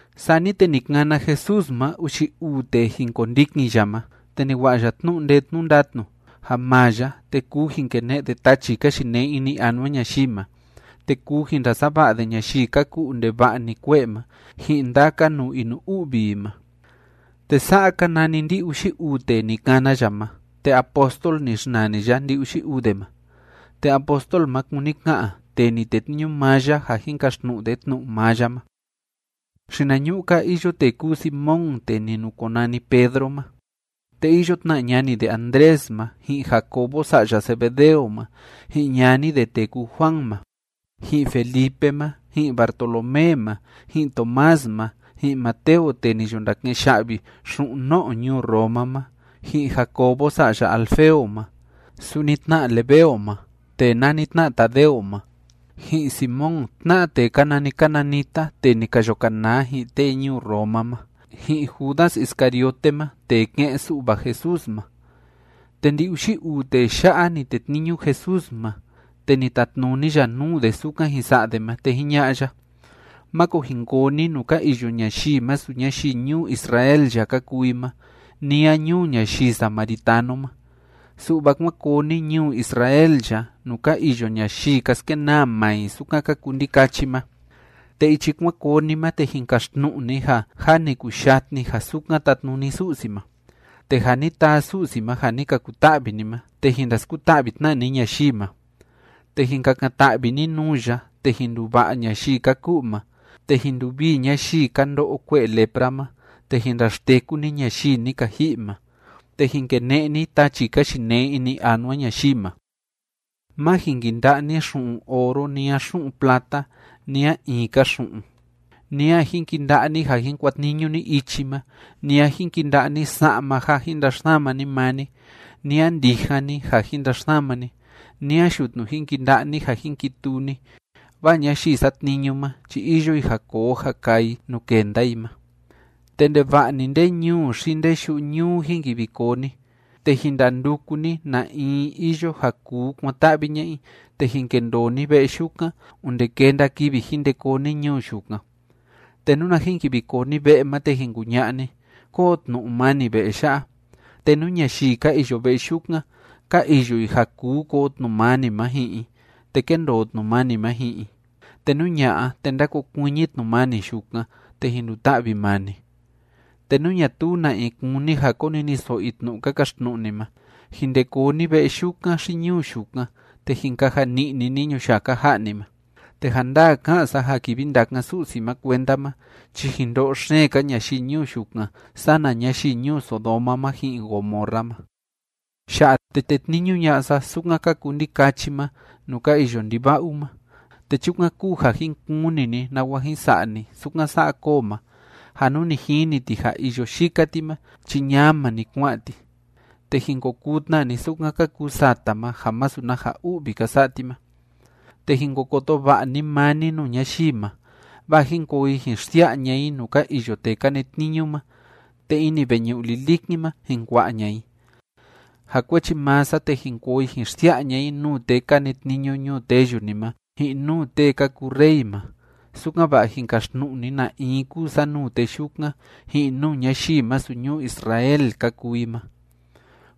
Sani te ni kana Jesús ma uxi uu tee jin kondikin ya ma, te ni wa'a ya tnu'u ndee tnu'u ndatnu ja maa ya, te kuu jin kene'e de tachi ka yinee ini anua ñayii ma, te kuu jin ndasava'a de ñayii ka ku'u ndeva'a‑ni kue'e ma ji'in ndaka nuu inu‑u'vi i ma. Te sa'a ka nani ndi‑uxi uu tee ni kana ya ma, te apóstol ni xnani ya ndi‑uxi uu de ma, (te apóstol ma kúni ka'an “tee ni tetniñu maa ya ja jin kaxtnu'u de tnu'u maa ya ma”): Xinañu'u‑ka iyo tee kúu Simón tee ni nukonani Pedro ma, te iyo tna ñani de Andrés ma, ji'in Jacobo sa'ya Zebedeo ma, ji'in ñani de tee kúu Juan ma, ji'in Felipe ma, ji'in Bartolomé ma, ji'in Tomás ma, ji'in Mateo tee ni yo ndake'en ya'vi xu'un no'o ñuu Roma ma, ji'in Jacobo sa'ya Alfeo ma, suni tna Lebeo ma tee nani tna Tadeo ma, ji'in Simón tna'a tee ka nani cananita tee ni ka yo kanaa ji'in tee ñuu Roma ma, ji'in Judas Iscariote ma tee ke'en‑su'va Jesús ma. Te ndi‑uxi uu tee ya'a ni tetniñu Jesús ma, te ni tatnuni ya nuu de sukan jin sa'a de ma, te jiña'a ya: ―Máko jin koo ni nuu ka iyo ñayii masu ñayii ñuu Israel ya ka kuu i ma, ni a ñuu ñayii samaritano ma. Su'va kuán koo ni ñuu Israel ya nuu ka iyo ñayii ka skenaa maa i sukan ka kuu ndikachi ma. Te ichi kuan koo ni ma te jin kaxtnu'u ni ja: “Jâ ni kuyatni ja sukan tatnuni Su'si ma.” Te ja ni taa Su'si ma ja ni ka kuta'vi ni ma, te jin ndaskuta'vi tna ni ñayii ma. Te jin kakan‑ta'vi ni nuu ya, te jin nduva'a ñayii ka ku'u ma, te jin nduvii ñayii ka ndo'o kue'e lepra ma, te jin ndaxteku ni ñayii ni ka ji'i ma, te jin kene'e ni tachi ka yinee ini anua ñayii ma. ’Má jin kinda'a ni xu'un oro, ni a xu'un plata, ni a in‑ka xu'un, ni a jin kinda'a ni ja jin kuatniñu ni ichi ma, ni a jin kinda'a ni sa'ma ja jin ndaxsama ni maa ni, ni a ndijan ni ja jin ndaxsama ni, ni a yutnu jin kinda'a ni ja jin kituu ni, vaa ñayii satniñu ma chi iyo i ja koo ja kaa i nuu kenda i ma. ’Te ndeva'a‑ni nde ñuu xi nde yu'u ñuu jin kivi koo ni, te jin ndanduku ni na in iyo ja kuu kuan‑ta'vi ña'a i, te jin kendoo ni ve'e yukan onde kenda kivi jin nde koo ni ñuu yukan. Te nuna jin kivi koo ni ve'e ma, te jin kuña'a ni: “¡Kóo tnu'u mani ve'e ya'a!” Te nú ñayii ka iyo ve'e yukan, ka iyo i ja kuu koo tnu'u mani ma ji'in i, te kéndoo tnu'u mani ma ji'in i, te nú ña'a, te ndákokuiñi tnu'u mani yukan, te jin nduta'vi maa ni. Te nú ñatuu na in kúni ja koniniso'o i tnu'u ka kaxtnu'u ni ma, jin nde koo ni ve'e yukan xi ñuu yukan, te jin kaja ni'ni ni ñuyaka ja'a ni ma. Te ja ndaa ká'an sa ja kivi ndakan Su'si ma kuenda ma chi jin ndo'o xeen‑ka ñayii ñuu yukan sana ñayii ñuu Sodoma ma ji'in Gomorra ma. ’Ya'a te tétniñu ña'a sa sukan ka kuu ndikachi ma nuu ka iyo ndiva'u ma, te chukan kúu ja jin kuni ni nawa jin sa'a ni sukan sa'a koo ma, ja nú ni jini ti ja iyo yika ti ma chi ñama‑ni kua'an ti, te jin ko kuu tna ni sukan ka kuu sata ma ja masu na ja u'vi ka sa'a ti ma. ’Te jin ko koto va'a ni maa ni nuu ñayii ma, vaa jin koo i jin xsia'a ña'a i nuu ka iyo tee ka netniñu ma, te ini veñu'u lilikin ma jin kua'a ña'a i. Ja kuechi maa sa te jin koo i jin xsia'a ña'a i nuu tee ka netniñu ñuu teyu ni ma ji'in nuu tee ka kuu rey ma, sukan‑va'a jin kaxtnu'u ni na in kúu sa nuu tee yukan ji'in nuu ñayii masu ñuu Israel ka kuu i ma.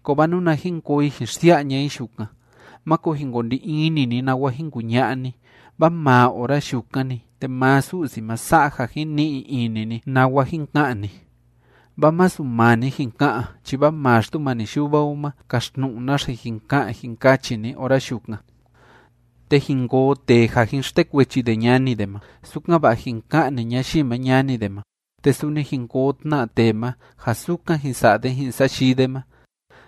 Kovaa nuna jin koo i jin xsia'a ña'a i yukan, máko jin ko ndi ini ni nawa jin kuña'a ni, vaa maa ora yukan‑ni, te maa Su'si ma sa'a ja jin ni'i ini ni nawa jin ka'an ni, vaa masu maa ni jin ka'an, chi vaa maa Xtumani Yuva o ma kaxtnu'u naxe jin ka'an jin kachi ni ora yukan. ’Te jin koo tee ja jin xtekuechi de ñani de ma, sukan‑va'a jin ka'ni ñayii ma ñani de ma, te suni jin koo tna tee ma ja sukan jin sa'a de ji'in sayii de ma,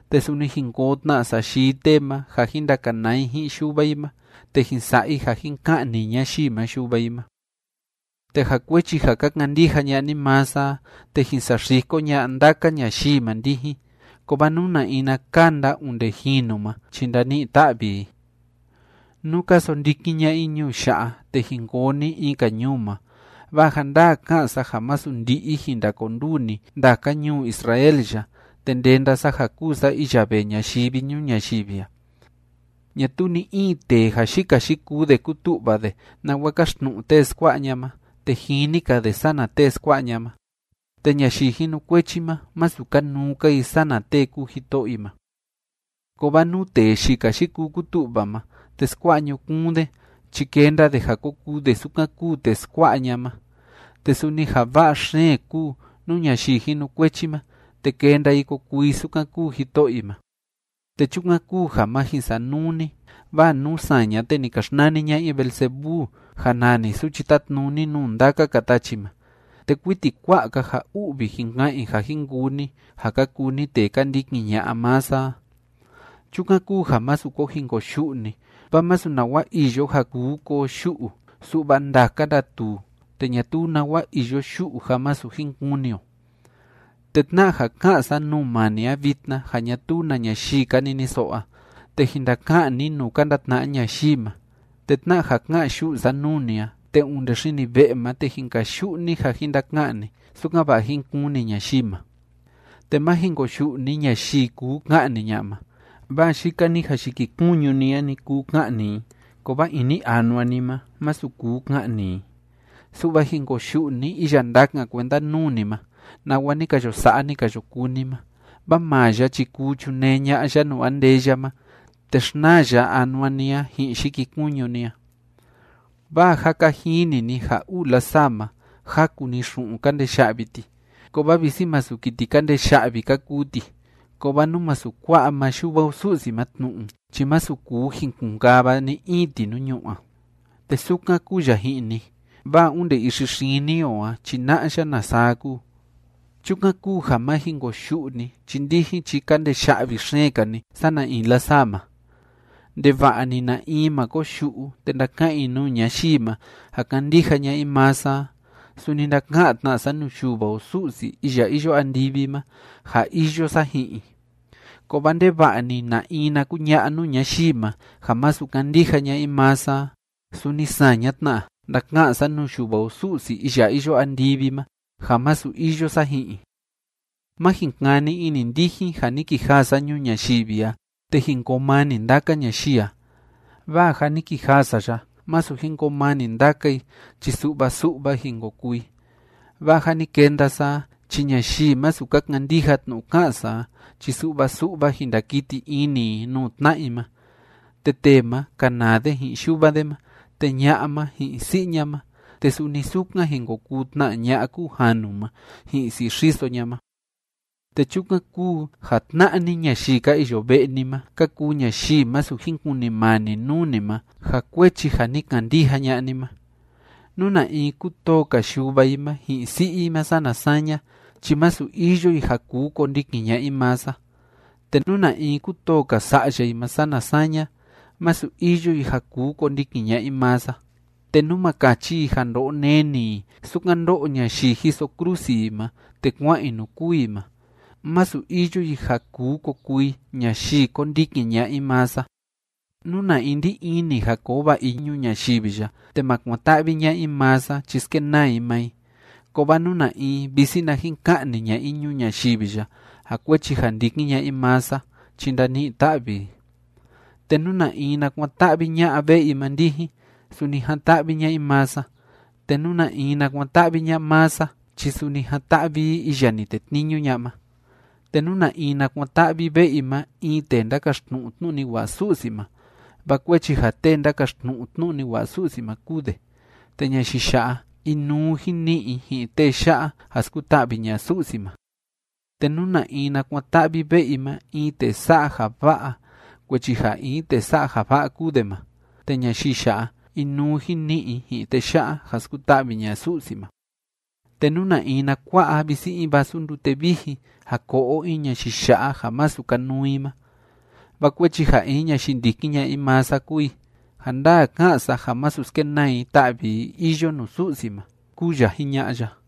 te suni jin koo tna sayii tee ma ja jin ndakanaa i ji'in yuva i ma, te jin sa'a i ja jin ka'ni ñayii ma yuva i ma. Te ja kuechi ja ka kandija ña'a ni maa sa a te jin saxiko ña'a ndaka ñayii ma ndijin, kovaa nú na in na kanda onde jinu ma chi ndani'i‑ta'vi i. Nú ka sondikin ña'a i ñuu ya'a, te jin koo ni in‑ka ñuu ma, vaa ja ndaa ká'an sa ja masu ndi'i jin ndakonduu ni ndaka ñuu Israel ya, te ndenda sa ja kúu sa iya vee ñayivi ñuu ñayivi a. ’Ñatuu ni‑in tee ja yika yikuu de kútu'va de nawa kaxtnu'u tee skua'a ña'a ma, te jini‑ka de sana tee skua'a ña'a ma, te ñayii jinukuechi ma, masu kanuu‑ka i sana tee kúu jito'o i ma. Kovaa nú tee yika yikuu kútu'va ma, te skua'a ñukuun de chi kenda de ja ko kuu de sukan kúu tee skua'a ña'a ma. Te suni ja va'a xeen kuu nú ñayii jinukuechi ma, te kenda i ko kuu i sukan kúu jito'o i ma. Te chukan kúu ja má jin sanuu ni, vaa nú saña, te ni ka xnani ña'a i Beelzebú ja nani suchi tátnuni nuu ndaka‑ka tachi ma, te kuiti kua'a‑ka ja u'vi jin ka'an i ja jin kuu ni ja ka kuu ni tee ka ndikin ña'a maa sa a. ’Chukan kúu ja másu ko jin koyu'u ni, vaa masu nawa iyo ja kuu koo yu'u, su'va ndaka ndatuu, te ñatuu nawa iyo yu'u ja masu jin kuni o. Te tna'a ja ká'an sa nuu maa ni a vitna ja ñatuu na ñayii ka niniso'o a, te jin ndaka'an ni nuu ka ndatna'a ñayii ma, te tna'a ja ká'an yu'u sa nuu ni a, te onde xini ve'e ma te jin kayu'u ni ja jin ndaka'an ni, sukan‑va'a jín kuni ñayii ma. Te má jin koyu'u ni ñayii kuu ka'ni ña'a ma, vaa yika‑ni ja yikikuñu ni a‑ni kuu ka'ni i, kovaa ini anua ni ma, masu kuu ka'ni i. Su'va jin koyu'u ni iya ndakan kuenda nuu ni ma nawa ni ka yo sa'a ni ka yo kuu ni ma, vaa maa ya chi kuu chunee ña'a ya nuu andeya ma te xnaa ya anua ni a ji'in yikikuñu ni a. Vaa jâ ka jini ni ja uu lasaa ma, jaku‑ni xu'un ka ndee ya'vi ti. Kovaa visi masu kiti ka ndee ya'vi ka kuu ti, kovaa nú masu kua'a maa Yuva o Su'si ma tnu'u chi masu kuu jin kun‑kava ni‑in ti nuu ñu'ú a. Te sukan kúu ya ji'in ni, vaa onde ixi xini o a chi na'a ya na saa kúu. Chukan kúu ja má jin koyu'u ni chi ndijin chi ka ndee ya'vi xeen‑ka ni sana in lasaa ma. Ndeva'a‑ni na in ma koyu'u te ndaka'an i nuu ñayii ma ja kándija ña'a i maa sa a, suni ndaka'an tna sa nuu Yuva o Su'si iya iyo andivi ma ja iyo sa ji'in i. Kovaa ndeva'a‑ni na in na kuña'a nuu ñayii ma ja masu kándija ña'a i maa sa a, suni saña tna ndaka'an sa nuu Yuva o Su'si iya iyo andivi ma ja masu iyo sa ji'in i. ’Má jin kani ini ndijin ja ni kijaa sa ñuu ñayivi a, te jin koo mani ndaka ñayii a. Vaa ja ni kijaa sa ya masu jin koo mani ndaka i, chi su'va su'va jin ko kuu i. Vaa ja ni kenda sa a, chi ñayii masu ka kandija tnu'u ká'an sa a chi su'va su'va jin ndakiti ini i nuu tna'a i ma, te tee ma kanaa de ji'in yuva de ma, te ña'a ma ji'in si'i ña ma, te suni sukan jin ko kuu tna ña'a kúu janu ma ji'in si'i xiso ña ma. Te chukan kúu ja tna'a ni ñayii ka iyo ve'e ni ma ka kuu ñayii masu jin kunimani nuu ni ma ja kuechi ja ni kandija ña'a ni ma. Nú na in kútoo‑ka yuva i ma ji'in si'i i ma sana saña, chi masu iyo i ja kuu kondikin ña'a i maa sa. Te nú na in kútoo‑ka sa'ya i ma sana saña, masu iyo i ja kuu kondikin ña'a i maa sa. Te nú ma kachi i ja ndo'o neni i, sukan ndó'o ñayii jiso krusi i ma te kua'an i nuu kûu i ma, masu iyo i ja kuu ko kuu i ñayii kondikin ña'a i maa sa. Nú na in ndí ini ja koo va'a i ñuu ñayivi ya te ma kuan‑ta'vi ña'a i maa sa chi skenaa i maa i. Kovaa nú na in visi na jin ka'ni ña'a i ñuu ñayivi ya ja kuechi ja ndikin ña'a i maa sa chi ndani'i‑ta'vi i. ’Te nú na in na kuan‑ta'vi ña'a ve'e i ma ndijin, suni jan‑ta'vi ña'a i maa sa. Te nú na in na kuan‑ta'vi ña'a maa sa chi suni jan‑ta'vi i iya ni tetniñu ña'a ma. Te nú na in na kuan‑ta'vi ve'e i ma in tee ndákaxtnu'u tnu'u ni wa'a Su'si ma vaa kuechi ja tee ndákaxtnu'u tnu'u ni wa'a Su'si ma kúu de, te ñayii ya'a, inuu jin ni'i i ji'in tee ya'a ja skuta'vi ña'a Su'si ma. Te nú na in na kuan‑ta'vi ve'e i ma in tee sa'a ja va'a kuechi ja in tee sa'a ja va'a kúu de ma, te ñayii ya'a, inuu jin ni'i i ji'in tee ya'a ja skuta'vi ña'a Su'si ma. Te nú na in na kua'a visi in vasu ndute vijin ja ko'o in ñayii ya'a ja masu kanuu i ma vaa kuechi ja in ñayii ndikin ña'a i maa sa kúu i, ja ndaa ká'an sa ja masu skenaa i ta'vi i iyo nuu Su'si ma ―kúu ya jiña'a ya.